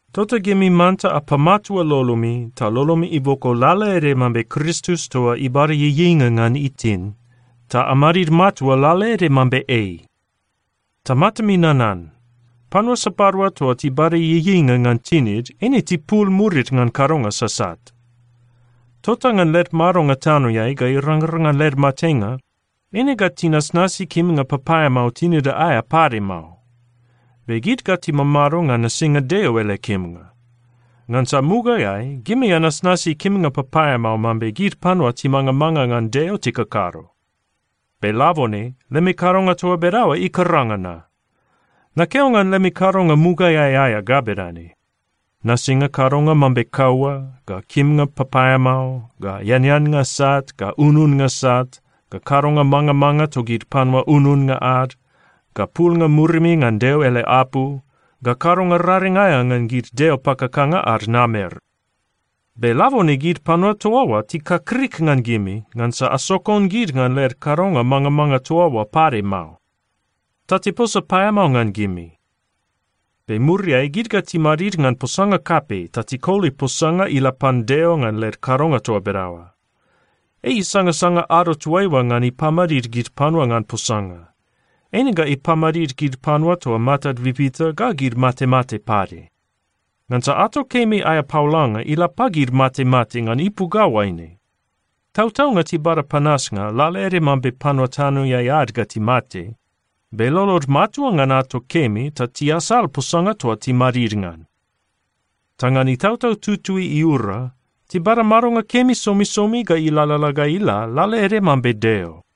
Tota gimi manta apamatua lolomi, ta lolomi iboko lalaede mambe Kristus toa ibada ieieinga ngan itin, ta amadid matua lalaede mambe ei. Ta matami nanan: Panua sapadua toa tibada ieieinga ngan tinid, eine tipul murid ngan kadonga sasat. Tota ngan led madonga tanoeai ga irangrang ngan led matenga, eine ga tinasnasi kimnga papaeamao tinida aea pade mao. Be gid ga timamado ngan nasinga Deo ele kimnga. Ngansa mugaeai gimi anasnasi kimnga papaeamao mambe gid panua timangamanga ngan Deo tikakado. Be labone lemi kadonga toa bedaoa ikaranga na. Nakeo ngan lemi kadonga mugaeai aea ga bedane: nasinga kadonga mambe kaua, ga kimnga papaeamao, ga eaneannga sat, ga ununnga sat, ga kadonga mangamanga togid panua ununnga ad, ga pulnga murimi ngan Deo ele apu, ga kadonga raring aea ngan gid deo pakakanga ad namer. Be labone gid panua toa oa tikakrik ngan gimi, ngansa asokon gid ngan led kadonga mangamanga toa oa pade mao, ta tiposa paeamao ngan gimi. Be muriai gid ga timadid ngan posanga kapei ta tikoli posanga ila pan Deo ngan led kadonga toa bedaoa. Ei isangasanga ado toaiua ngan ipamadid gid panua ngan posanga. Eine ga ipamadid gid panua toa matad bibita ga gid matemate pade. Ngansa ato kemi aea paolanga ila pagid matemate ngan ipu ga oaine: Tautaunga tibada panasnga lalaede mambe panua tanoeai ad ga timate, be lolod matua ngan ato kemi ta tiasal posanga toa timadid ngan. Ta ngan Itautau Tutui iura, tibada madonga kemi somisomi ga ilalala ga ila, lalaede mambe Deo.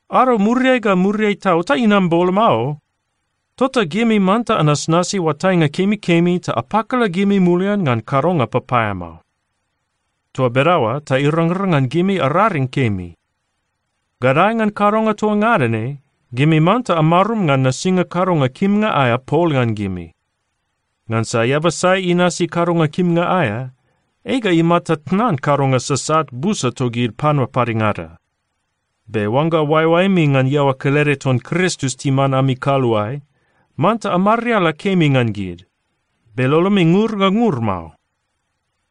Ado muriai ga muriai tau ta inam boloma o. Tota gimi manta anasnasi oatainga kemikemi ta apakala gimi mulian ngan kadonga papaeamao. Toa bedaoa ta irangrang ngan gimi araring kemi. Gadae ngan kadonga toa ngada ne, gimi manta amarum ngan nasinga kadonga kimnga aea pol ngan gimi. Ngansa eaba sai inasi kadonga kimnga aea, ei ga imata tnan kadonga sasat busa togid panua padengada. Be oangga oaeoaemi ngan iaoa kelede ton Kristus timan ami kaluae, manta amariala kemi ngan gid, be lolomi ngur ga ngur mao.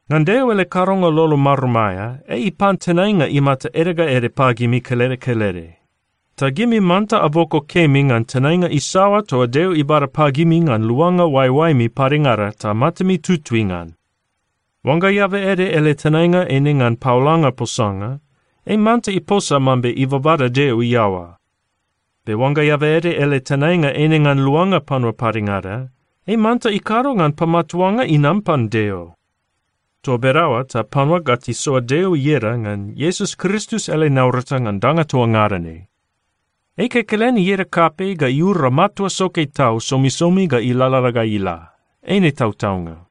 Ngan Deo ele kadonga lolo marum aea, ei ipan tenainga imata ede ga ede pagimi kelede kelede. Ta gimi manta aboko kemi ngan tenainga isaoa toa Deo ibada pagimi ngan luanga oaeoaemi padengada ta matami tutui ngan. Oangga eaba ede ele tenainga eine ngan paolanga posanga, ei manta iposa mambe ibabada Deo iaoa. Be oangga eaba ede ele tenainga eine ngan luanga panua padengada, ei manta ikado ngan pamatuanga inam pan Deo. Toa bedaoa ta panua ga tisoa Deo ieda ngan Iesus Kristus ele naurata ngan danga toa ngada ne. Ei kekelen ieda kapei ga iura matua soke tau somisomi ga ilalala ga ila. Eine tautaunga.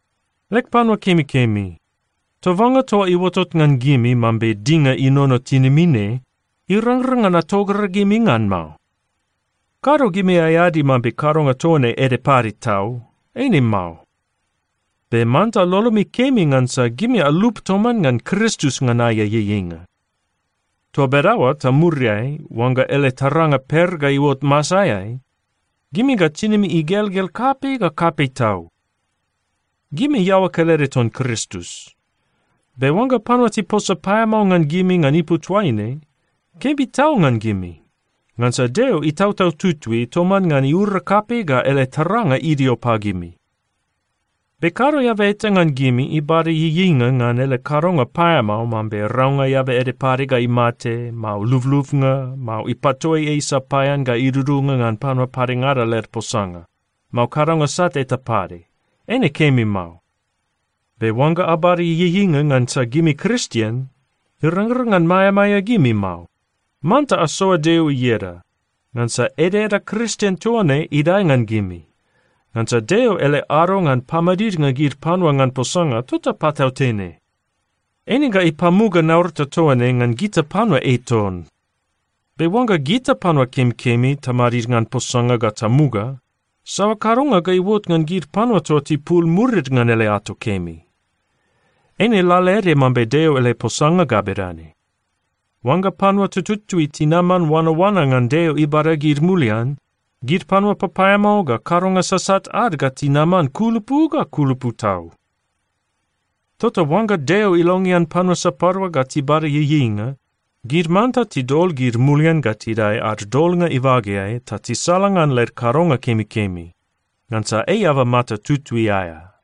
Leg panua kemikemi, tobanga toa iuotot ngan gimi mambe dinga inono tinimi ne, irangrang ngan atogragimi ngan mao. Kado gimi aeadi mambe kadonga toa ne ede pade tau. Eine mao. Be manta lolomi kemi ngansa gimi alup toman ngan Kristus ngan aea ieieinga. Toa bedaoa ta muriai, oangga ele taranga per ga iuot masaeai, gimi ga tinimi igelgel kapei ga kapei tau. Gimi iaoa kelede ton Kristus. Be oangga panua tiposa paeamao ngan gimi ngan ipu toaine, kemi tau ngan gimi. Ngansa Deo Itautau Tutui toman ngan iura kapei ga ele taranga idio pagimi. Be kado eaba eta ngan gimi ibada ieieinga ngan ele kadonga paeamao mambe raunga eaba ede pade ga imate, mao lublubnga, mao ipatoi ei sapaean ga idudunga ngan panua padengada led posanga, mao kadonga sat eta pade. Eine kemi mao. Be oangga abada ieieinga ngansa gimi Kristien, irangrang ngan maeamaea gimi mao. Manta asoa Deo ieda, ngansa edaeda Kristien toa ne idae ngan gimi. Ngansa Deo ele ado ngan pamadidnga gid panua ngan posanga, tota patautene. Eine ga ipamuga naurata toa ne ngan gita panua ei ton. Be oangga gita panua kemikemi tamadid ngan posanga ga tamuga, saoa kadonga ga iuot ngan gid panua toa tipul murid ngan ele ato kemi? Eine lalaede mambe Deo ele posanga ga bedane, “Oangga panua tututui tinaman oanaoana ngan Deo ibada gid mulian, gid panua papaeamao ga kadonga sasat ad ga tinaman kulupu ga kulupu tau.” Tota oangga Deo ilongean panua sapadua ga tibada ieieinga, gid manta tidol gid mulian ga tidae ad Dolnga ibageai ta tisalangan led kadonga kemikemi. Ngansa ei eaba mata tutui aea.